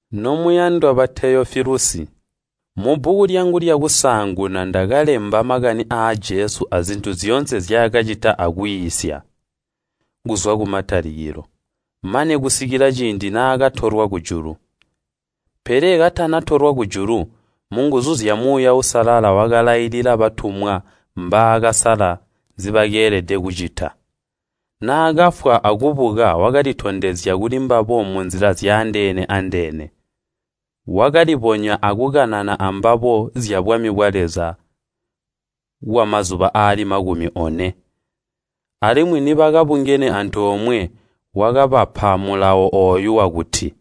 Nomuyandwa ba Teyofilusi, Mubbuku lyangu lyakusaanguna ndakalemba makani aa Jesu azintu zyoonse nzyaakacita akwiisya, kuzwa kumatalikilo, mane kusikila ciindi naakatolwa kujulu. Pele katanatolwa kujulu, munguzu zya Muuya Uusalala wakalailila batumwa mbaakasala nzibakeelede kucita. Naakafwa akubuka wakalitondezya kulimbabo munzila zyaandeene-andeene. Wakalibonya akukanana ambabo zyabwami bwa Leza kwamazuba aali makumi one. Alimwi nibakabungene antoomwe, wakabapa mulawo ooyu wakuti,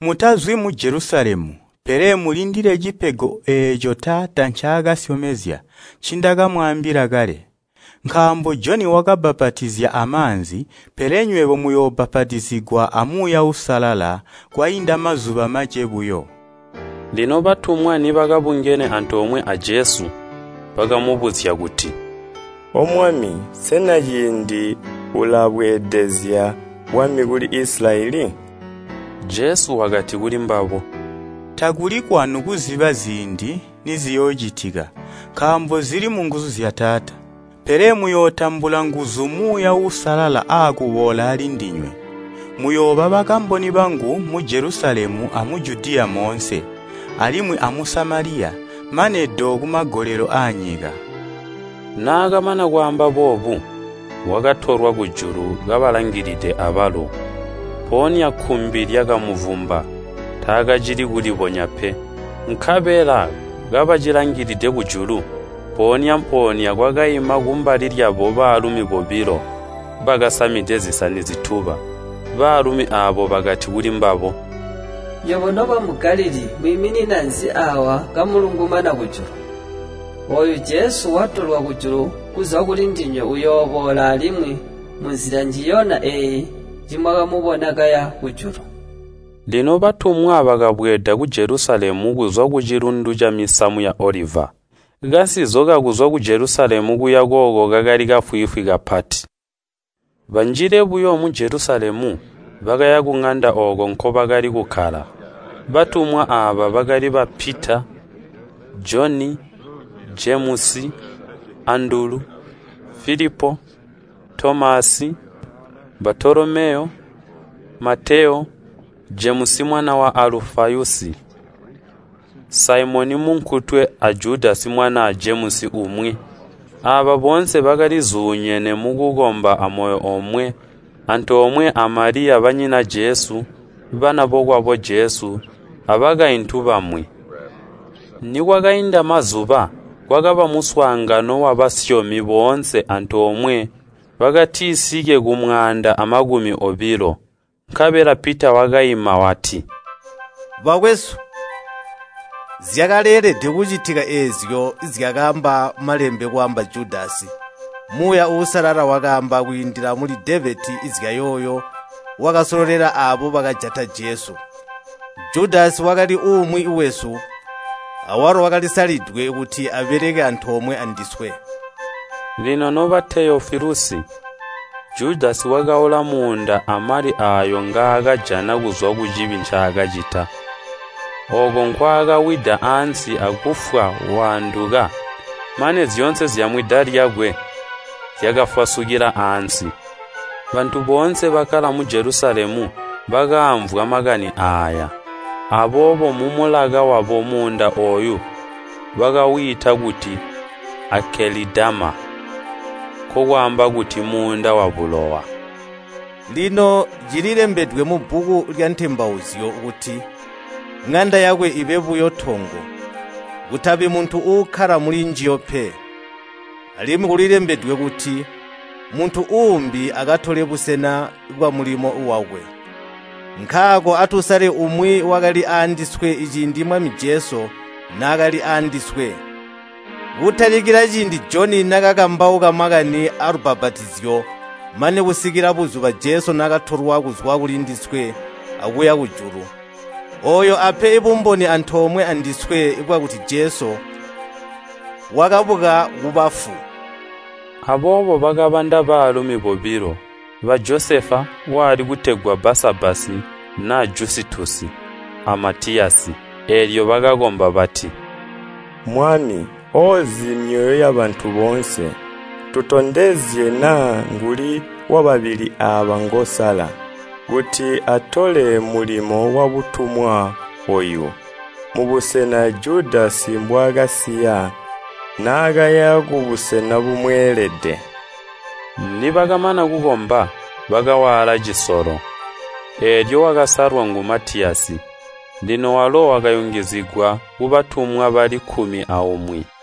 “Mutazwi mu Jelusalemu, pele mulindile cipego eeco Taata ncaakasyomezya, ncindakamwaambila kale. Nkaambo Joni wakabbapatizya amaanzi, pele nywebo muyoobbapatizigwa a Muuya Uusalala kwainda mazuba mace buyo.” Lino batumwa nibakabungene antoomwe a Jesu, bakamubuzya kuti, “O Mwami, sena ciindi ulabweedezya bwami kuli Isilayeli?” Jesu wakati kulimbabo, “Takuli kwanu kuziba ziindi niziyoocitika, nkaambo zili munguzu zya Taata. Pele muyootambula nguzu Muuya Uusalala aakuboola alindinywe, muyooba bakamboni bangu mu Jelusalemu amu Judiya moonse, alimwi amu Samaliya, mane do kumagolelo aanyika.” Naakamana kwaamba boobu, wakatolwa kujulu kabalangilide abalo, mpoonya kkumbi lyakamuvumba, taakacili kulibonya pe. Nkabela kabacilangilide kujulu, mpoonya-mpoonya kwakaima kumbali lyabo baalumi bobilo bakasamide zisani zituba. Baalumi aabo bakati kulimbabo, “Nywebo nobamu Galilii mwiimina nzi aawa akulungumana kujulu? Ooyu Jesu watolwa kujulu kuzwa kulindinywe uyooboola alimwi munzila njiyonya eeyi njimwamubona kaya kujulu.” Lino batumwa bakabweeda ku Jelusalemu kuzwa kucilundu camisamu ya Oliva. Kasinzo kakuzwa ku Jelusalemu kuya kooko kakali kafwiifwi kapati. Banjile buyo mu Jelusalemu, bakaya kuŋanda ooko nkobakali kukkala, batumwa aaba bakali ba Pita, Joni, Jemusi, Andulu, Filipo, Tomasi, Baatolomeyo, Mateyo, Jemusi mwana wa Alufayusi, Saimoni munkutwe, a Judasi mwanaa Jemusi umwi. Aaba boonse bakalizuunyene mukukomba amoyo omwe, antoomwe a Maliya banyina Jesu, bana bokwabo Jesu, abakaintu bamwi. Nikwakainda mazuba, kwakaba muswaangano wabasyomi boonse antoomwe bakatisike kumwaanda amakumi obilo. Nkabela Pita wakaima wati, “Bakwesu, zyakaleelede kucitika eezyo zyakaamba Malembe kwaamba Judasi. Muuya Uusalala wakaamba kwiindila muli Devedi zyayooyo wakasololela aabo bakajata Jesu. Judasi wakali umwi wesu, awalo wakalisalidwe kuti abeleke antoomwe andiswe.” (Lino noba Teyofilusi Judasi wakaula muunda amali aayo ngaakajana kuzwa kucibi ncaakacita. Ooko nkwaakawida aansi akufwa waanduka, mane zyoonse zyamwida lyakwe zyakafwasukila aansi. Bantu boonse, bakkala mu Jelusalemu bakaamvwa makani aaya, aboobo mumulaka wabo muunda ooyo bakawiita kuti Akelidama, nkokwaamba kuti, “Muunda wabulowa.”) “Lino cililembedwe mubbuku lya Ntembauzyo kuti, ‘ŋanda yakwe ibe buyo tongo. Kutabi muntu uukkala mulinjiyo pe!’ Alimwi kulilembedwe kuti, ‘Muntu uumbi akatole busena bwamulimo wakwe!’ “Nkaako atusale umwi wakali andiswe ciindi Mwami Jesu naakali aandiswe. Kutalikila ciindi Joni naakakambauka makani aalubbapatizyo mane kusikila buzuba Jesu naakatolwa kuzwa kulindiswe akuya kujulu. Ooyo ape bumboni antoomwe andiswe bwakuti Jesu wakabuka kubafu.” Aboobo bakabanda baalumi bobilo, ba Josefa wali kutegwa Baasabbasi (naa Jusitasi) a Matiyasi. Eelyo bakakomba bati, “Mwami, oozi myoyo yabantu boonse, tutondezye naa nguuli wababili aaba ngoosala kuti atole mulimo wabutumwa ooyu, mubusena Judasi mbwaakasiya naakaya kubusena bumweelede.” Nibakamana kukomba, bakawaala cisolo, eelyo wakasalwa ngu Matiyasi. Lino walo wakayungizigwa kubatumwa bali kkumi aumwi.